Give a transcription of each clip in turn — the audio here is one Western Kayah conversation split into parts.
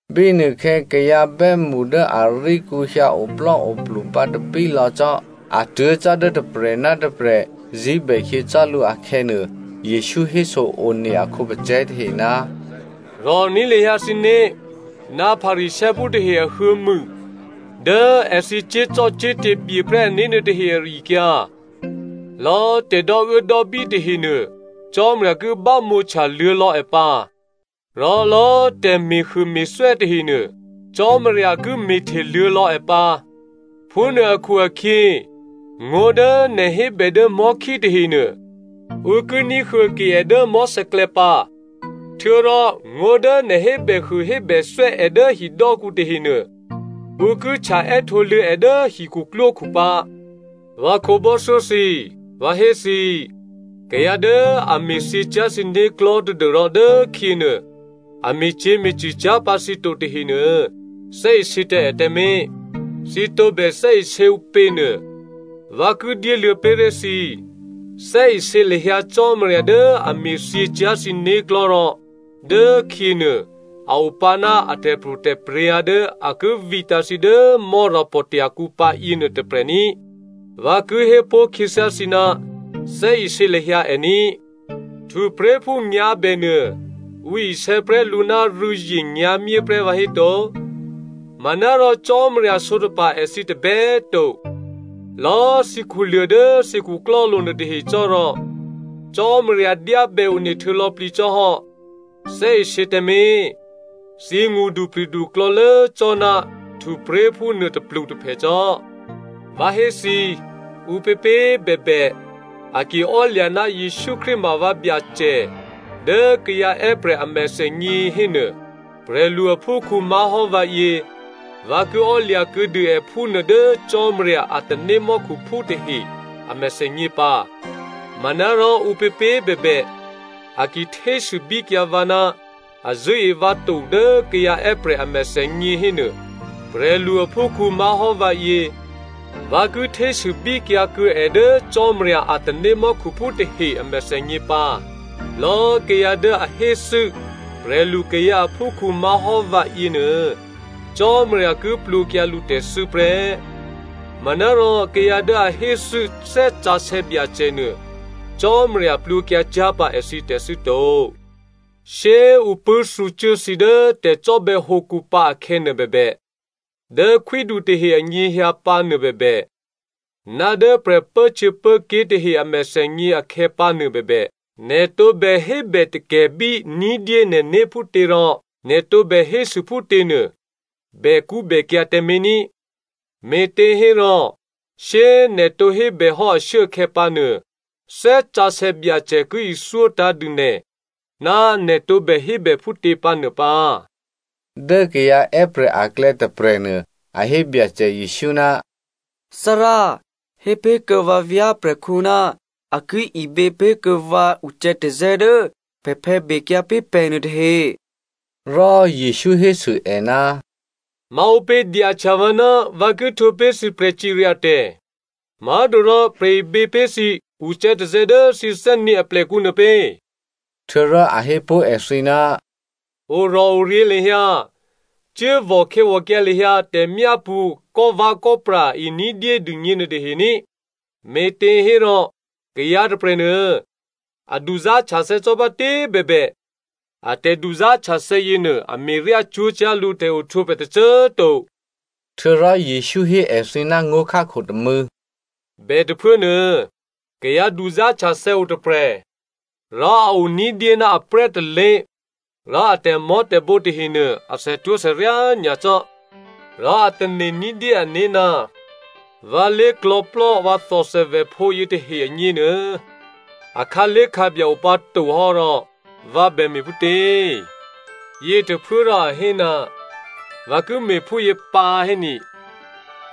Bínuôkhè̌ kayǎ bè́mṳ dố aríkǔ hyǎ oplò́oplu bǎtapí lò̌ cò́, a tuố̤ cò́ dố tôprè̤ ná tôprè̤ zí̤bè khyě cò́ lǔ akhè̌nuô, Jesǔ héso-one a khǒpacè̤̌ tahe, “Rò̤ní̤ lahyǎ thǐné̤ ná Pharisěophú tahe ahuô̌mû dố èthǐ cyé̤zò́cò́te̤ byeprè́ ané̤ nuôtahe ari-akyǎ. Lò̌꤮ tè̤ dò́uốdò́bí tahenuô, Cò́marya ki bámǒhtya luô̌lò̌ è pǎ, rò lò̌꤮ tè̤me̤huôme̤thwè́ tahenuô, Cò́marya ki me̤hteluô̌lò̌ è pǎ. Phúnuô akhu-akhyě ngó̤ dố nè̤ hébè dố mò̤́khí tahenuô, ǔ ki ní̤huô̌ke è dố mò̤́sè̌klè̌ pǎ. Htuô̌rò ngó̤ dố nè̤ hébèhuôhébèthwè́ è dố hidò́kǔ tahenuô, ǔ ki htya è́htǒluô̌ è dố hikhuklwókhu pǎ. “Vǎ khǒbò́thyó thǐ꤮, vǎ hé thǐ, kayǎ dố a me̤thyě cyá̤ thǐ né̤klò̤́ tadû́rò dốkhyěnuô, a me̤cyě̤me̤cṳ̂ cyá̤ pǎ thǐ to tahenuô, thè́isě tǎ è tǎmé̤. Thǐ tǒbè thè́isě ǔpě nuô, vǎ ki dyéluô̌ pé̤ré̤ thǐ. Thè́isě lahyǎ Cò́marya dố a me̤thyě cyá̤ thǐ né̤klò̤́ rò dốkhyěnuô a o pǎ ná a tè̤pro̤tè̤prya̤ dố a ki vǐtǎ̤ thǐ dố Mò́rapò̤tya̤ kǔ pǎ yěnuô tôprè̤ ní꤮. Vǎ ki hé pó̤ khyěthyá thǐ ná thè́isě lahyǎ è ní꤮. Htupré̤phú nyǎ̤bènuô ǔ isè̌ prè́ lǔ ná rû̌zye nyǎ̤myé prè́ vǎhéto? Manárò Cò́marya sǒtapa̤ èthǐ tôbè꤮ to. Lò̌꤮ thǐ khuluô̤ dố thǐ khuklò́lo̤ nuôtahe cò́rò, Cò́marya dyábè one htuô̌lò̌plǐ cò́hò́. Thè́isě tǎmé̤! Thǐ ngṳdupri̤du klò̌lố cò́ ná htupré̤phú nuô tôplutôphè cò́. “Vǎ hé thǐ, ǔpěpě꤮ bèbè a ki ò́lya̤ ná Jesǔ Krístu ma vǎ Byacè dố kayǎ è́prè̤ a mèthènyě hénuô, prè̤lu aphúkhǔ má̤hò́ vǎyě, vǎ ki ò́lya̤kuô̌dû è phúnuô dố Cò́marya a tanémò́khuphú tahe a mèthènyě pǎ. Manárò ǔpěpě꤮ bèbè a ki htésûbíkyǎ vǎ ná a zṳ̂́e vǎ to dố kayǎ è́prè̤ a mèthènyě hénuô, prè̤lu aphúkhǔ má̤hò́ vǎyě, vǎ ki htésûbíkyǎ kuô̌ è dố Cò́marya a tanémò́khuphú tahe a mèthènyě pǎ. Lò̌꤮ kayǎ dố a héthû́ prè̤lukayǎ aphúkhǔ má̤hò́ vǎ yěnuô, Cò́marya ki plwǒkyǎ lǔtè̤thû́ prè́. Manárò kayǎ dố a héthû́ Thè́ Sǎsè̌ Byacè nuô, Cò́marya plwǒkyǎ cyá̤ pǎ èthǐ tè̤thû́ to. “Shyé꤮ ǔ pṳ̂́thǔcuố thǐ dố tè̤cò́bè̌hǒkǔ pǎ akhè̌nuô bèbè, dố khwídu tahe anyěhyǎ pǎnuô bèbè, ná dố prè̤pốhtyěpốké̤ tahe a mèthènyě akhè̌pǎnuô bèbè, nè̤ tǒbè hébè takè̤bí ní̤dyé nè̤né̤ phútě rò nè̤ tǒbè hésû phútěnuô bèkṳ́bèkyǎ̤ tǎmé̤ ní. Me̤těhérò shyé꤮ nè̤ tǒ hébèhò́ ashuốakhè̌ pǎnuô, Thè́ Sǎsè̌ Byacè ki ithyótǎ̤ dû nè̤ ná nè̤ tǒbè hébè phútě pǎ nuô pǎ.” Dố kayǎ è́prè̤ aklè̌ tôprè̤nuô a hé Byacè Jesǔ, “Thárá꤮ hé pé̤kuô̌ vǎ vyá̤prè̤khǔ ná a ki ibě pé̤kuô̌ vǎ ucè̌tazè̌ dố pè̤phè̌ bekyǎ pé̤ pè̤nuô tahe.” Rò Jesǔ hésû è, “Ma ǔpě dyahtya vǎ ná vǎ ki htwǒ pé̤ thǐ prè̤cirya tè̤, má̤torò prè̤ ibě pé̤ thǐ ucè̌tazè̌ dố thǐ thè́nyě̤ aplèkǔ nuô pě.” Htuô̌rò a hé pó̤ èthǐ, “Orò̤oryě̤ lahyǎ, cuốvò̤ khè̌vò̤kyǎ lahyǎ tè̤myápṳ̌ kò́vè̌kò́pra e ní̤dyé dûgně nuôtahe ní꤮, me̤těhérò kayǎ tôprè̤nuô, a duzá̤htyathè̌ cò́bátě꤮ bèbè, a tè̤duzá̤htyathè̌ yěnuô a me̤ryá cwó̤cyá̤ lǔ tè̤ohtwǒprè̤ tôcô꤮ to.” Htuô̌rò Jesǔ hé èthǐ ná ngó̤khákho tômû̌, “Bètôphuốnuô kayǎ duzá̤htyathè̌ o tôprè̤, rò a o ní̤dyé ná aprè́ tôlé̤ rò a tè̤mò̤́tè̤bǒ tahenuô, a thètwó̤thèryá nyacò́. Rò a tane̤ ní̤dyé ané̤, ‘Vǎ lé̤klò̤̌plò́ vǎ thòthèvèphǒ yětahe agněnuô, a khǎlé̤khǎbya o pǎ to hò́, rò vǎ bè me̤ phútě?’ “Yětôphuốrò a hé, ‘Vǎ ki me̤phúyě pǎ héni,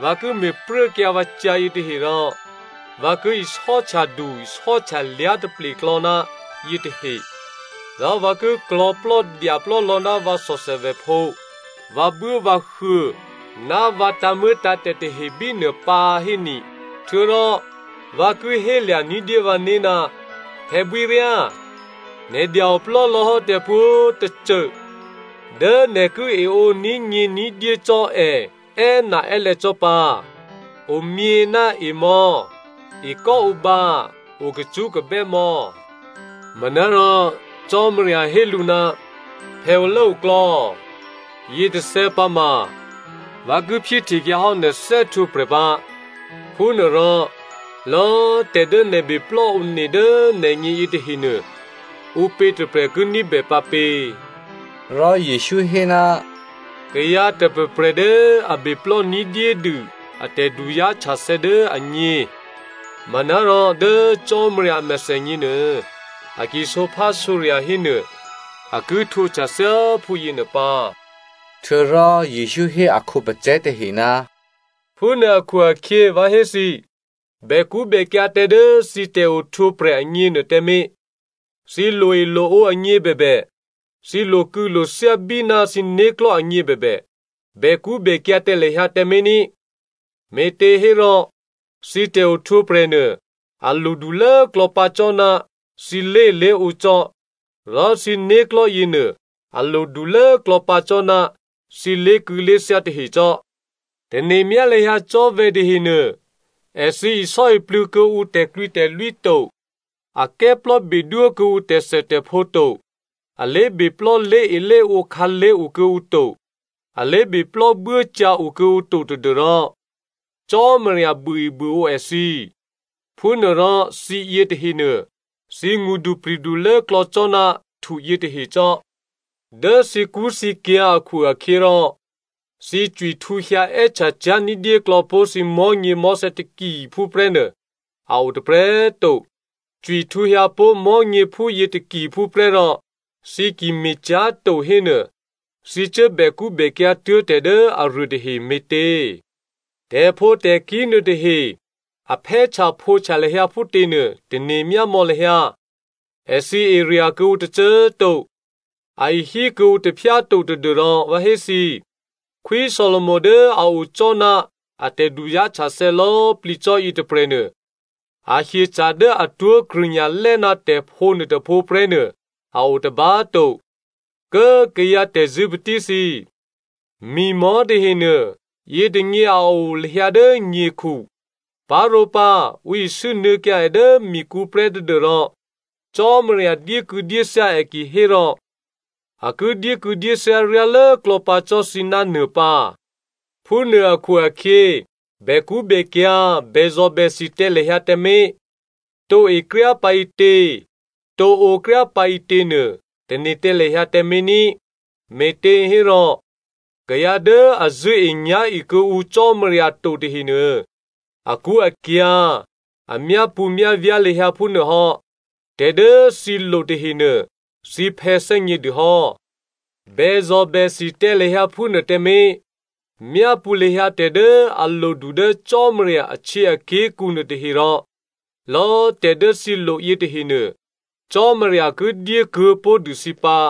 vǎ ki me̤pruốkyǎ vǎ cyǎ yětahe rò vǎ ki isò́htyadu isò́htyalyá̤ taple klò̌ ná yětahe, rò vǎ ki klò̤̌plò́dyaplò́ lò̌ ná vǎ thòthèvèphǒ, vǎbuốvǎhuô̌ ná vǎ tǎ̤muô̌tǎ̤tè̤ tahe bínuô pǎ héni. Htuô̌rò vǎ ki hélya̤ ní̤dyé vǎné̤, Phè̌bwíryá, nè̤ dya-oplò́ lò̌ hò́ tè̤pwǒ̤꤮ tôcô dố nè̤ ki eǒní̤ nyě̤ ní̤dyé cò́ è è́naè́lè̌ cò́ pǎ. Omyě ná emò̌, ekò́ǒbǎ, okacṳ́kabè́ mò̌.’” “Manárò Cò́marya hé lǔ, ‘Phè̌olốoklò̌, yětôthè̌ pǎ ma vǎ ki phyéhtekyǎ hò́ nè̤ thè́htwǒprè̤ pǎ. Phúnuôrò lò̌꤮ tè̤ dố nè̤ beplò́ one dố nè̤gně yětahenuô ǔpě tôprè̤ ki ní̤bè pǎ pě?’” Rò Jesǔ hé, “Kayǎ tôprè̤prè̤ dố a beplò́ ní̤dyédû a tè̤duzá̤htyathè̌ dố agně, manárò dố Cò́marya a mèthènyěnuô, a ki sǒphásǒrya̤ hénuô a ki htwǒhtya thyáphú yěnuô pǎ.” Htuô̌rò Jesǔ hé a khǒpacè̤̌ tahe, “Phúnuô akhu-akhyě vǎ hé thǐ, bèkṳ́bèkyǎ̤ tǎ dố thǐ tè̤ohtwǒprè̤ agněnuô tǎmé̤. Thǐ loe loǒ agně bèbè, thǐ lokû̌lothyá bíná thǐ né̤klò̤́ agně bèbè, bèkṳ́bèkyǎ̤ tǎ lahyǎ tǎmé̤ ní. Me̤těhérò thǐ tè̤ohtwǒprè̤ nuô a lodulốklò̌ pǎ cò́ ná thǐ lé̤elé̤ǒ cò́, rò thǐ né̤klò̤́ yěnuô a lodulốklò̌ pǎ cò́ ná thǐ lé̤kû̌lé̤thyá tahe cò́. Tane̤myá lahyǎ cò́vè tahenuô, èthǐ isò́iplû̌ kuô̌ǔ tè̤klwǐtè̤lwí to, a kè́plò́bedwó kuô̌ǔ tè̤thètè̤phǒ to. A lé̤beplò́ lé̤elé̤ǒ khǎlé̤ o kuô̌ǔ to, a lé̤beplò́ buốcyǎ o kuô̌ǔ to tadû́rò Cò́marya buôebuôǒ èthǐ. Phúnuôrò, thǐ yětahenuô, thǐ ngṳdupri̤du lốklò̌ cò́ ná htu yětahe cò́. Dố thǐkṳ́thǐkyǎ̤ akhu-akhyěrò, thǐ cwihtǔhyǎ è́htya cyá̤ ní̤dyéklò̌ pó̤ thǐ mò̤́nyěmò̤́thè̌ takiphú prè́nuô a o tôprè̤꤮ to. Cwihtǔhyǎ pó̤ mò̤́nyě phúyě takiphú prè́ rò, thǐ ki me̤cyá̤to hénuô thǐ cuố bèkṳ́bèkyǎ̤ tuố̤ tè̤ dố aruô tahe me̤tě? “Tè̤phǒtè̤kí̤ nuôtahe a phè́htyaphǒhtya lahyǎ phútěnuô, tane̤ myámò̌ lahyǎ. Èthǐ erya̤ kuô̌ǔ tôcô꤮ to, a ihí kuô̌ǔ taphyá to tadû́rò vǎ hé thǐ꤮, Khwí Solomo dố a o cò́ ná a tè̤duzá̤htyathè̌ lò̌꤮ plǐ cò́ yětôprè̤nuô, a hyeca̤ dố atwó̤ krṳ̂nya̤lè́ ná tè̤phǒ nuôtôphǒ prè́nuô a o tôba꤮ to. Kố꤮ kayǎ tè̤zṳ̂́patí thǐ꤮, mi̤mò̤́ tahenuô, yětônyě a o lahyǎ dố nyekhu, parǒpǎ ǔ isû́nuô̌kyǎ è dố mikǔ prè́ tadû́rò Cò́marya dyékû̌dyéthyá è kihérò a ki dyékû̌dyéthyá ryá lốklò̌ pǎ cò́ thǐ ná nuô pǎ. Phúnuô akhu-akhyě, bèkṳ́bèkyǎ̤ bèzò̤bèthi tǎ lahyǎ tǎmé̤. Tǒ ekryá pǎ ǐtě, tǒ ǒkryá pǎ ǐtěnuô, tane̤ tǎ lahyǎ tǎmé̤ ní. Me̤těhérò, kayǎ dố a zṳ̂́enyá̤e kuô̌ǔ Cò́marya to tahenuô, akṳ́akyǎ̤, a myápṳ̌myávyá̤ lahyǎ phúnuôhò́. Tè̤ dố thǐ lo tahenuô thǐ phè̌ thè́gnědû hò́. Bèzò̤bèthi tǎ lahyǎ phúnuô tǎmé̤! Myápṳ̌ lahyǎ tè̤ dố a lodu dố Cò́marya ahtyěaké̤kǔ nuôtahe rò lò̌꤮ tè̤dố thǐ lo yětahenuô, Cò́marya ki dyé kuô̌pó̤dû thǐ pǎ.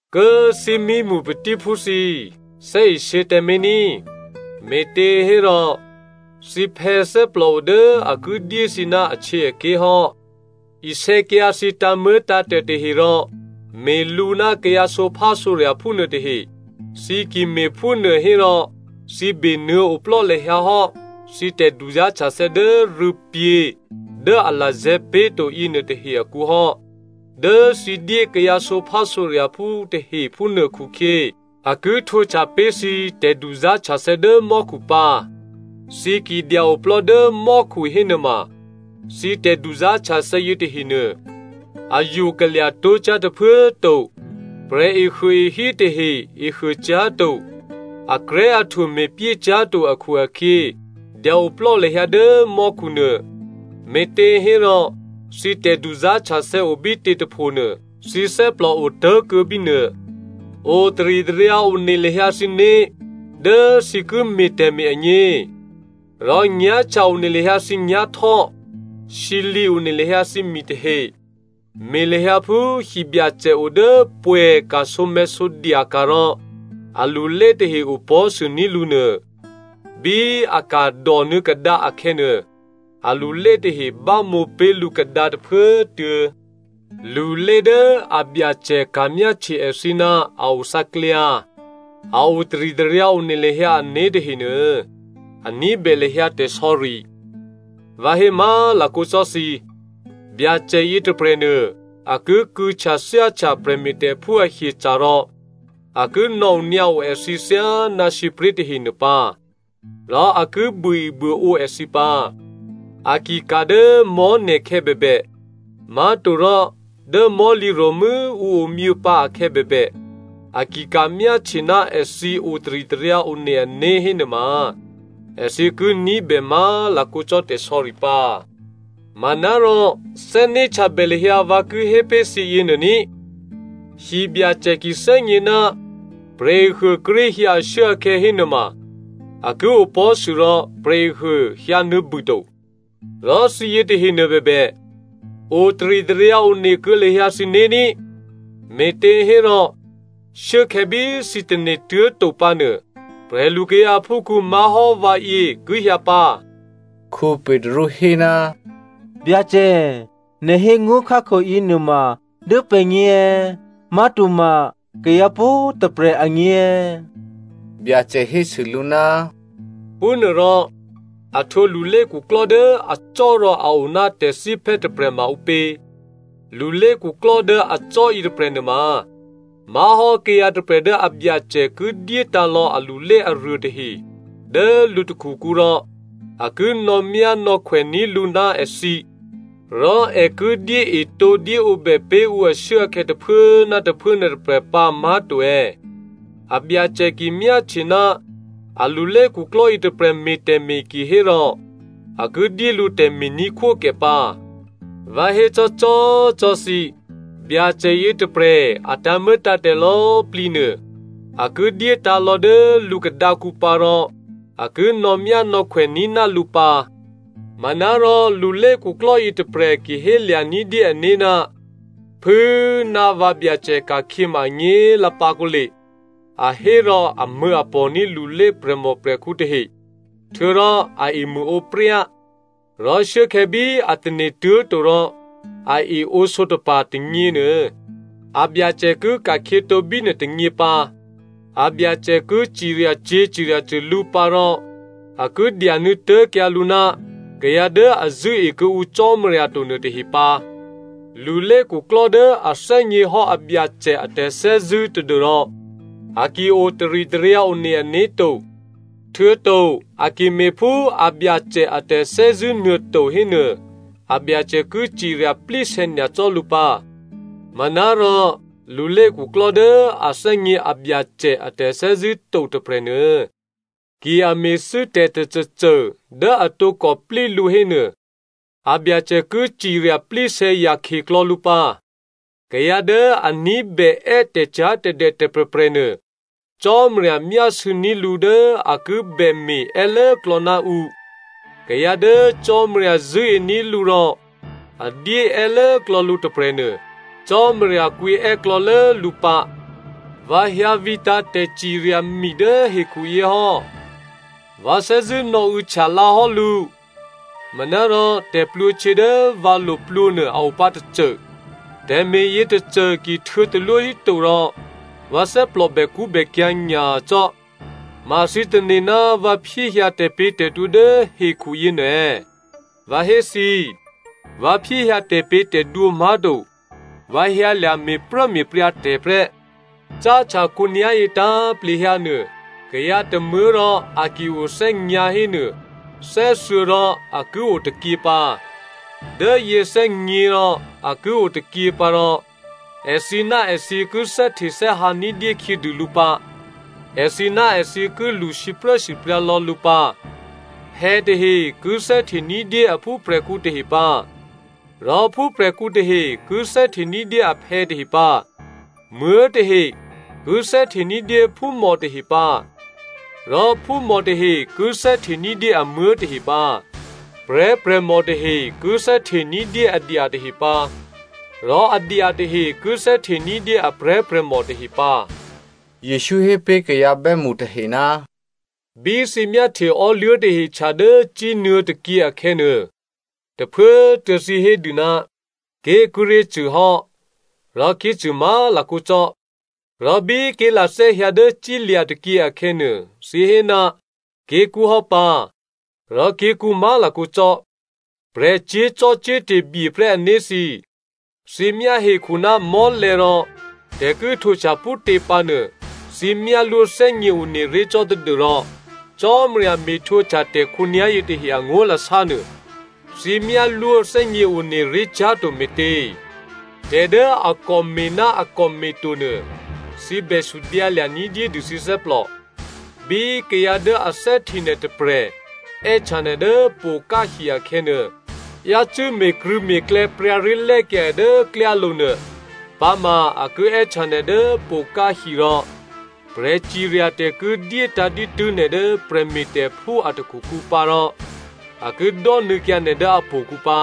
“Kố꤮ thímímṳ patíphú thǐ꤮, thè́isě tǎmé̤ ní꤮, me̤těhérò thǐphè̌ thè́plòo dố a ki dyé thǐ ná ahtyěaké̤ hò́. Isè̌kyǎ thǐ tǎ̤muô̌tǎ̤tè̤ tahe rò me̤lǔ ná kayǎ sǒphásǒrya̤phú nuôtahe. Thǐ ki me̤phúnuô hérò thǐ benuô̌ oplò́ lahyǎ hò́ thǐ tè̤duzá̤htyathè̌ dố rû̌pyě̤ dố a lazè̤̌ pé̤to yěnuôtahe akǔ hò́. Dố thǐ dyé kayǎ sǒphásǒrya̤phú tahe phúnuô khukhyě, a ki htwǒhtya pé̤ thǐ tè̤duzá̤htyathè̌ dố mò́khu pǎ. Thǐ ki dya-oplò́ dố mò́khu hénuôma, thǐ tè̤duzá̤htyathè̌ yětahenuô a yokalya̤ tó̤cyá̤ tôphuố꤮ to, prè̤ehuôehí tahe ehuôcyá̤to, akrè̤́ahtwo me̤pyé cyá̤ to akhu-akhyě dya-oplò́ lahyǎ dố mò́khunuô. Me̤těhérò, thǐ tè̤duzá̤htyathè̌ obítě tôphonuô, thǐ thè́plò otố̤kuô̌ bínuô. “Otaritaryǎ one lahyǎ thǐné̤ dố thǐ ki me̤ tè̤me̤ agně, rò nyá̤htya one lahyǎ thǐnyá̤htò́, sǐlǐ one lahyǎ thǐmi tahe. Me̤ lahyǎ phú hibyacè o dố pwè̌ ka̤sǒmè̤̌sǒdya ka̤ rò alulé tahe opò̤́sûní̤ lǔnuô. Bí a ka̤ dònuô̌ kadǎ akhè̌nuô, alulé tahe bámǒ pé̤ lǔ kadǎ tôphuốtuô̌. Lulé dố abyacè ka̤myáhtye èthǐ ná a othǎklyǎ, a otaritaryǎ one lahyǎ ané̤ tahenuô, a ní̤bè lahyǎ tè̤sò̌ri. Vǎ hé má̤lakǒ cò́ thǐ, Byacè yětôprè̤nuô a ki kû̌htyathyáhtya prè̤me̤tè̤phú ahyeca̤ rò a ki nò̌onyǎo èthǐ thyáná sǐpré̤ tahenuô pǎ, rò a ki buôebuôǒ èthǐ pǎ. A ki ka̤ dố mò̤́ne̤khè̌ bèbè, má̤torò dố mò̤́lǐro̤mû́ ǔ omyěpǎ akhè̌ bèbè, a ki ka̤myáhtye ná èthǐ otaritaryǎ one ané̤ hénuôma, èthǐ ki ní̤bè má̤lakǒ cò́ tè̤sò̌ri pǎ. Manárò thè́né̤htyabè lahyǎ vǎ ki hé pé̤ thǐ yěnuô ní꤮. Hibyacè ki thè́gně ná prè̤ehuô kíré̤ hyǎ ashuốakhè̌ hénuôma a ki opò̤́sû rò prè̤ehuô hyǎnuô̌bû to. Rò thǐ yětahenuô bèbè, otaritaryǎ one kuô̌ lahyǎ thǐné̤ ní꤮, me̤těhérò shuốkhè̌ bí thǐ tane̤tuố̤ to pǎnuô, prè̤lukayǎ aphúkhǔ má̤hò́ vǎyě ki hyǎ pǎ.” Petru hé, “Byacè꤮ nè̤ hé ngó̤khákho yěnuôma dố pè̤gně è̌? Má̤toma, kayǎ pwǒ̤꤮ tôprè̤ agně è̌?” Byacè hésû lǔ, “Phúnuôrò, a htwǒ lulékhuklò́ dố acò́ rò a o ná tè̤thíphè́ tôprè̤ma ǔpě? Lulékhuklò́ dố acò́ yětôprè̤ nuôma má̤hò́ kayǎ tôprè̤ dố abyacè ki dyétǎ̤ lò̌ alulé aruôtahe dố lǔ takhukǔ rò a ki nò̌myánò̌khwèní̤ lǔ ná èthǐ, rò è ki dyéetǒdyéǒbè pé̤ ǔ ashuốakhè̌ tôphuố ná tôphuố nuôtôprè̤ pǎ má̤to è̌? Abyacè ki ka̤myáhtye ná a lulékhuklò́ yětôprè̤ me̤ tè̤me̤ kihérò a ki dyé lǔ tè̤me̤ní̤khwókè pǎ. Vǎ hécò́cò́꤮ cò́ thǐ, Byacè yětôprè̤ a tǎ̤muô̌tǎ̤tè̤ lò̌꤮ plǐnuô a ki dyétǎ̤lò̌ dố lǔ khadǎkǔ pǎ rò a ki nò̌myánò̌khwè ní̤ ná lǔ pǎ. Manárò lulékhuklò́ yětôprè̤ ki hélya̤ ní̤dyé ané̤, ‘Phû꤮ ná vǎbyacè ka̤khyěma anyě̤꤮ lǎ pǎ kǒle,’ a hé rò amṳ̂̌apò̤ní̤ lulé prè̤mòprè̤khǔ tahe, htuô̌rò a emṳ̂ǒpryá. Rò shuốkhè̌ bí a tane̤ tuố̤to rò a eǒ sǒtapa̤ tônyěnuô, abyacè ki ka̤khyětǒ bínuô tônyě pǎ. Abyacè ki ciryacyě̤ ciryacṳ̂ lǔ pǎ rò a ki dyanuô̌ tố̤kyǎ lǔ ná kayǎ dố a zṳ̂́e kuô̌ǔ Cò́marya to nuôtahe pǎ. “Lulékhuklò́ dố a thè́gněhò́ abyacè a tè̤thè́zṳ̂́ tadû́rò a ki o taritaryǎ one ané̤ to, htuô̌to a ki me̤phú abyacè a tè̤thè́zṳ̂́nuô to hénuô, abyacè ki cirya plísè̌ nyacò́ lǔ pǎ. Manárò lulékhuklò́ dố a thè́gně abyacè a tè̤thè́zṳ̂́ to tôprè̤nuô, ki a me̤thû́ tè̤ tôcôcô dố a tǒkò plí lǔ hénuô, abyacè ki cirya plísè̌ yakhyeklò̌ lǔ pǎ. Kayǎ dố a ní̤bè è́ tè̤cyá̤tè̤dè tôprè̤prè̤nuô, Cò́marya myásû̌ní̤ lǔ dố a ki bème̤ è́lốklò̌ ná ǔ. Kayǎ dố Cò́marya zṳ̂́ení̤ lǔ rò a dyé è́lốklò̌ lǔ tôprè̤nuô, Cò́marya kwǐ è́klò̌lố lǔ pǎ. “Vǎ hyǎ vǐtǎ̤ tè̤cirya mi dố hekhuyě hò́. Vǎ thè́zṳ̂́ nò̌û̌htya lǎ hò́ lǔ. Manárò tè̤plwǒhtyě dố vǎ lo plwǒ nuô a opǎ tôcô. Tè̤me̤ yětôcô ki htuô̌talwó híto rò vǎ thè́plò bèkṳ́bèkyǎ̤ nyacò́. Ma thǐ tane̤ ná vǎ phyéhyǎ tè̤pě̤tè̤dwǒ dố hekhu yěnuô è̌? Vǎ hé thǐ꤮, vǎ phyéhyǎ tè̤pě̤tè̤dwǒ má̤to. Vǎ hyǎlya̤ me̤pruốme̤pryǎ tè̤ prè́. Cáhtya khǒnyá̤yě tǎ̤plehyǎ nuô, kayǎ tômuố̤ rò a ki o thè́nyǎ̤ hénuô thè́thuô̌ rò a ki o tôkyě pǎ, dố yě thè́gně rò a ki o tôkyě pǎ rò èthǐ ná èthǐ ki thè́htethè́hǎ ní̤dyé khyědû lǔ pǎ. Èthǐ ná èthǐ ki lṳ sipruốsipryǎ lò̌ lǔ pǎ. Phè̌ tahe ki thè́hte ní̤dyé a phúprè̤khǔ tahe pǎ, rò phúprè̤khǔ tahe ki thè́hte ní̤dyé aphè̌ tahe pǎ. Muố̤ tahe ki thè́hte ní̤dyé phúmò tahe pǎ, rò phúmò tahe ki thè́hte ní̤dyé amuố̤ tahe pǎ, prè̤́prè̤mò tahe ki thè́hte ní̤dyé adya tahe pǎ, rò adya tahe ki thè́hte ní̤dyé a prè̤́prè̤mò tahe pǎ.” Jesǔ hé pé̤ kayǎ bè́mṳ tahe, “Bí thǐ myáhtye ò́luố̤tahe htya dố cínuô̌ tôkyě akhè̌nuô, tôphuốtuô̌ thǐ hé dû, ‘Ké̤ kíré̤ cṳ̂ hò́,’ rò ké̤cṳ̂ má̤lakǒ cò́. Rò bí ké̤lathè́ hyǎ dố cílya̤ tôkyě akhè̌nuô, thǐ hé, ‘Ké̤kṳ́ hò́ pǎ,’ rò ké̤kṳ́ má̤lakǒ cò́. Prè̤ cyé̤zò́cò́te̤ byeprè́ ané̤ thǐ꤮, thǐ myá hekhu ná mò́lè̤̌ rò tè̤ ki htwǒhtya phútě pǎnuô thǐ myálwó thè́gněone ré̤ cò́ tadû́rò Cò́marya me̤htwǒhtya tè̤ khǒnyá̤yě tahe angó̤lasánuô, thǐ myálwó thè́gněone ré̤ cyá̤to me̤tě? “Tè̤ dố a kòme̤ ná a kòme̤to nuô, thǐ bè sudyǎlya̤ ní̤dyédû thǐ thè́plò. Bí kayǎ dố a thè́hte nè̤ tôprè̤ è́htya nè̤ dố pokáhi akhè̌nuô, yácû́ me̤krṳ̂̌me̤klè̌ pryǎré̤lè́kyǎ è dố klyálo̤nuô. Pǎma a ki è́htya nè̤ dố pokáhi rò prè̤ciryatè̤ ki dyétǎ̤ dǐtû́ nè̤ dố prè̤me̤tè̤phú a takhukǔ pǎ rò a ki dò́nuô̌kyǎ nè̤ dố htò̌kǔ pǎ.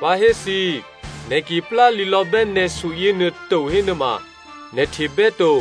Vǎ hé thǐ꤮, nè̤ ki plálǐlò̌bè́ nè̤su yěnuô to hénuôma, nè̤ htebè́ to.”